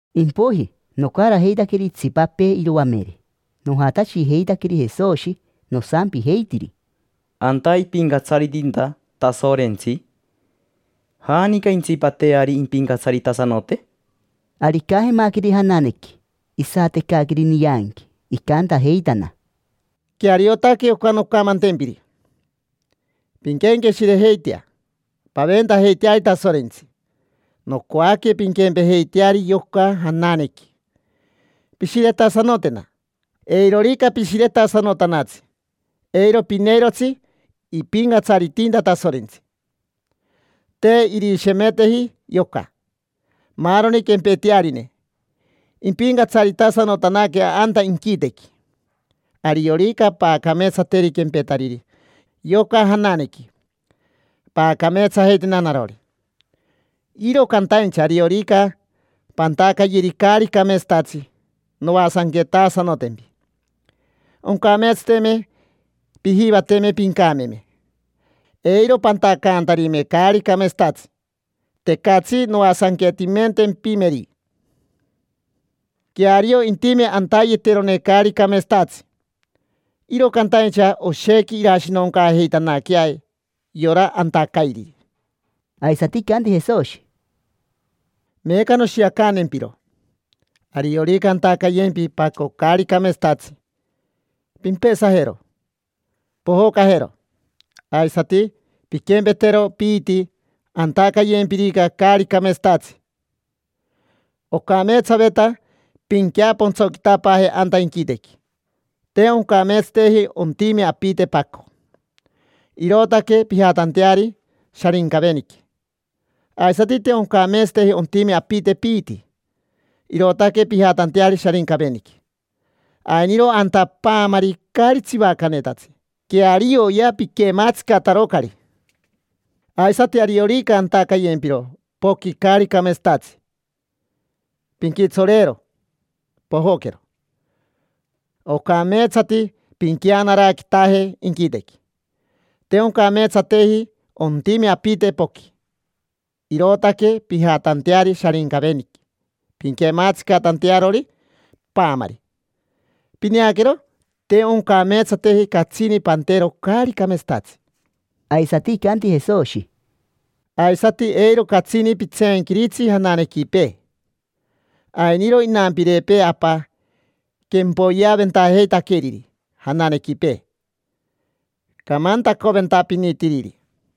Impoiji, nocarajeitaqueri itsipapee iroamere, nojatashijeitaqueri Jesoshi, nosampijeitiri: —Anta ipincatsaritinta Tasorentsi, ¿janica intsipateari impincatsaritasanote? Ari icajemaqueri jananequi, isatecaqueri nianqui, icantajeitana: —Queariotaque oca noncamantempiri: pinquenqueshirejeitea, paventajeiteari Tasorentsi; nocoaque pinquempejeiteari yoca jananequi, pishiretasanotena. Eirorica pishiretasanotanatsi, eiro pineirotsi ipincatsaritinta Tasorentsi. Te irishemeteji yoca: maaroni quempetearine impincatsaritasanotanaque anta inquitequi. Ariorica paacameetsateri quempetariri yoca jananequi, paacameetsajeitena narori. Iro cantaincha ariorica pantacayeri caari cameetsatatsi, noasanquetasanotempi. Oncameetsateme pijivateme pincameme eiro pantacantarime caari cameetsatatsi. Tecatsi noasanquetimentempimeri. Queario intime antayeterone caari cameetsatatsi, iro cantaincha oshequi irashinoncaajeitanaquea yora antacairiri. Aisati icanti Jesoshi: —Meeca noshiacantempiro. Ariorica antacayempi paco caari cameetsatatsi, pimpesajero, pojocajero; aisati pinquempetero piiti antacayempirica caari cameetsatatsi. Ocameetsaveta pinqueapontsoquitapaaje anta inquitequi, te oncameetsateji ontime apite paco, irootaque pijatanteari Sharincaveniqui, aisati te oncameetsateji ontime apite piiti, irootaque pijatanteari Sharincaveniqui. Ainiro anta paamari caari tsivacanetatsi: quearioya piquemaatsicatarocari. Aisati ariorica antacayempiro poqui caari cameetsatatsi, pinquitsoreero, pojoquero. Ocameetsati pinqueanaraquitaje inquitequi; te oncameetsateji ontime apite poqui, irootaque pijatanteari Sharincaveniqui pinquematsicatantearori paamari. Pineaquero, te oncameetsateji catsini pantero caari cameetsatatsi. Aisati icanti Jesoshi: —Aisati eiro catsini pitseenquiritsi jananequipee. Ainiro inampirepee Apa quempoyeaventajeitaqueriri jananequipee, camantacoventapinitiriri.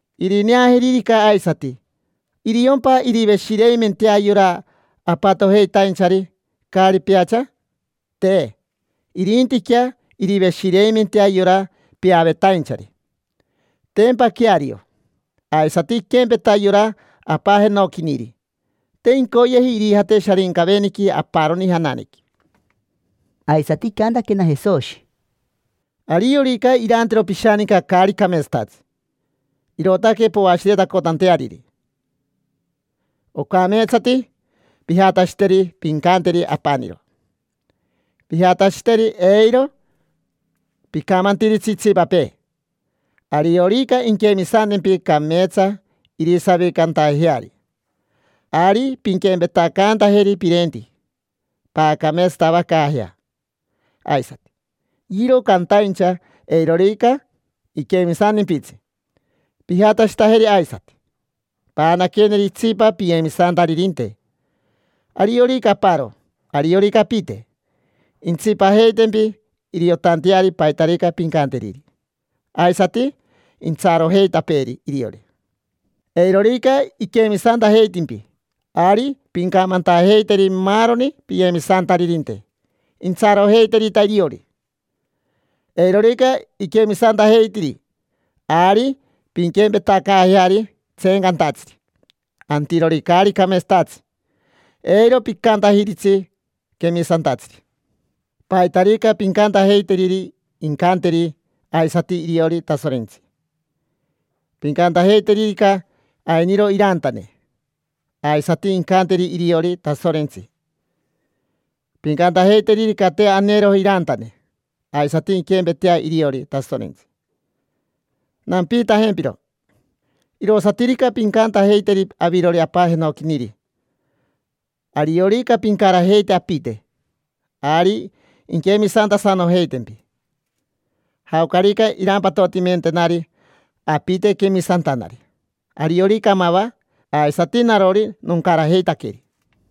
Irineajeririca aisati, ¿iriompa iriveshireimentea yora apatojeitainchari caari peacha? Te, irintiquea iriveshireimentea yora peavetainchari. Tempa queario. Aisati iquempeta yora Apa jenoquiniri: te incoyeji irijate Sharincaveniqui aparoni jananequi. Aisati icantaquena Jesoshi: —Ariorica irantero pishaninca caari cameetsatatsi, irootaque poashiretacotanteariri, ocameetsati pijatashiteri, pincanteri. Apaniro pijatashiteri, eiro picamantiritsi itsipapee. Ariorica inquemisantempi cameetsa irisavicantajeari, ari pinquempetacantajeri pirenti, paacameetsatavacaajea aisati. Iro cantaincha eirorica iquemisantimpitsi, pijatashitajeri aisati, paanaqueri itsipa piyemisantaririnte: ariorica aparo, ariorica apite. Intsipajeitempi iriotanteari paitarica pincanteriri, aisati intsarojeitapeeri iriori. Eirorica iquemisantajeitimpi, ari pincamantajeiteri maaroni piyemisantaririnte, intsarojeiterita iriori. Eirorica iquemisantajeitiri, ari pinquempetacaajeari tseencantatsiri, antirori caari cameetsatatsi; eiro picantajiritsi quemisantatsiri. Paitarica pincantajeiteriri incanteri aisati iriori Tasorentsi. Pincantajeiteririca ainiro irantane, aisati incanteri iriori Tasorentsi. Pincantajeiteririca te aneroji irantane, aisati inquempetea iriori Tasorentsi. Nampiitajempiro: irosatirica pincantajeiteriri avirori Apa jenoquiniri; ariorica pincarajeite apite, ari inquemisantasanojeitempi. Jaocarica irampatotimentenari apite quemisantanari, ariorica mava, aisati narori noncarajeitaqueri.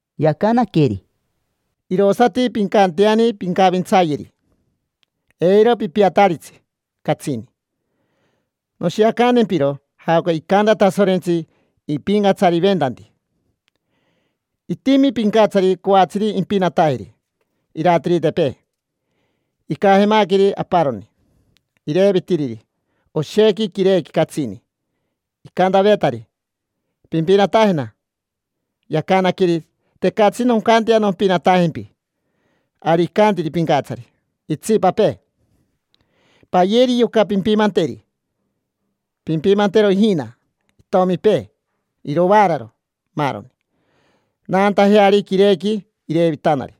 Yacanaqueri: —Irosati pincanteani pincavintsayeri: eiro pipiataritsi catsini. Noshiacantempiro jaoca icanta Tasorentsi ipincatsariventanti. Itimi pincatsari coatsiri impinatajeri iratiritepee. Icajemaqueri aparoni, irevitiriri oshequi quirequi catsini. Icantavetari: “Pimpinatajena”. Yacanaqueri: “Tecatsi noncantea nompinatajempi”. Ari icantiri pincatsari itsipapee: “Payeri yoca. Pimpimanteri, pimpimantero ijina, itomipee, irovaararo, maaroni, naantajeari quirequi irevitanari”.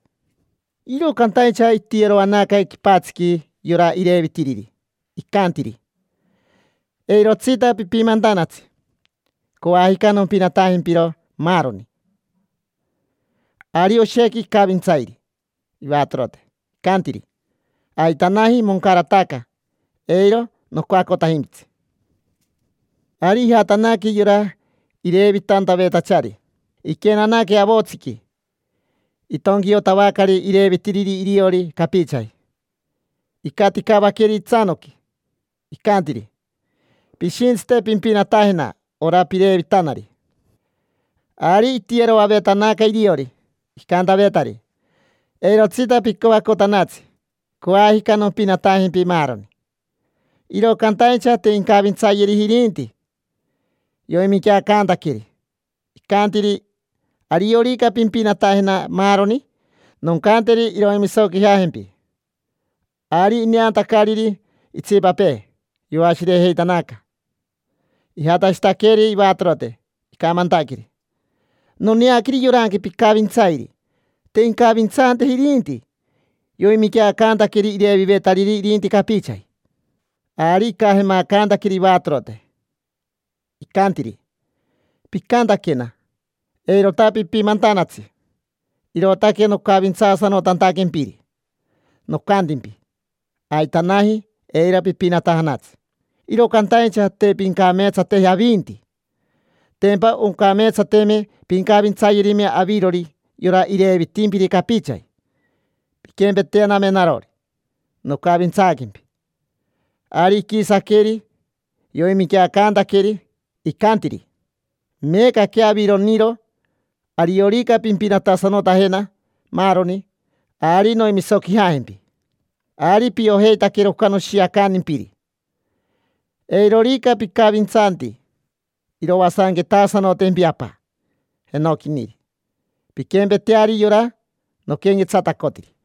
Iro cantaincha itiyeroanaca quipatsiqui yora irevitiriri, icantiri: “Eirotsita pipimantanatsi. Coajica nompinatajempiro, maaroni”. Ari oshequi icavintsairi ivatorote, icantiri: “Aitanaji, moncarataca, eiro nocoacotajimpitsi”. Ari ijatanaque yora irevitantavetachari. Iquenanaque avotsiqui, itonquiotavacari irevitiriri iriori capichaji. Icaticavaqueri itsanoqui, icantiri: “Pishintsite pimpinatajena ora pirevitanari”. Ari itiyeroavetanaca iriori, icantavetari: “Eirotsita picoacotanatsi, coajica nompinatajempi maaroni”. Iro cantaincha te incavintsayeriji irinti. Yoiminqueacantaqueri, icantiri: “Ariorica pimpinatajena maaroni, noncanteri iroimisoquijajempi”. Ari ineantacariri itsipapee, yoashirejeitanaca. Ijatashitaqueri ivatorote, icamantaqueri: “Noneaqueri yoranqui picavintsairi, te incavintsanteji irinti. Yoiminqueacantaqueri irevivetariri irinti capichaji”. Ari icajemacantaqueri ivatorote, icantiri: “Picantaquena: ‘Eirota pipimantanatsi’, irootaque nocavintsaasanotantaquempiri, nocantimpi: ‘Aitanaji, eiro pipinatajanatsi’. Iro cantaincha te pincameetsateji avinti. Tempa oncameetsateme pincavintsayerime avirori yora irevivetimpiri capichaji, pinquempetename narori nocavintsaaquempi”. Ari iquisaqueri, yoiminqueacantaqueri, icantiri: “Meecaquea aviroriniro, ariorica pimpinatasanotajena maaroni, ari noimisoquijajempi”. Ari piojeitaquero oca noshiacantimpiri. Eirorica picavintsanti, iroasanquetasanotempi Apa jenoquiniri, pinquempeteari yora noquenquetsatacotiri.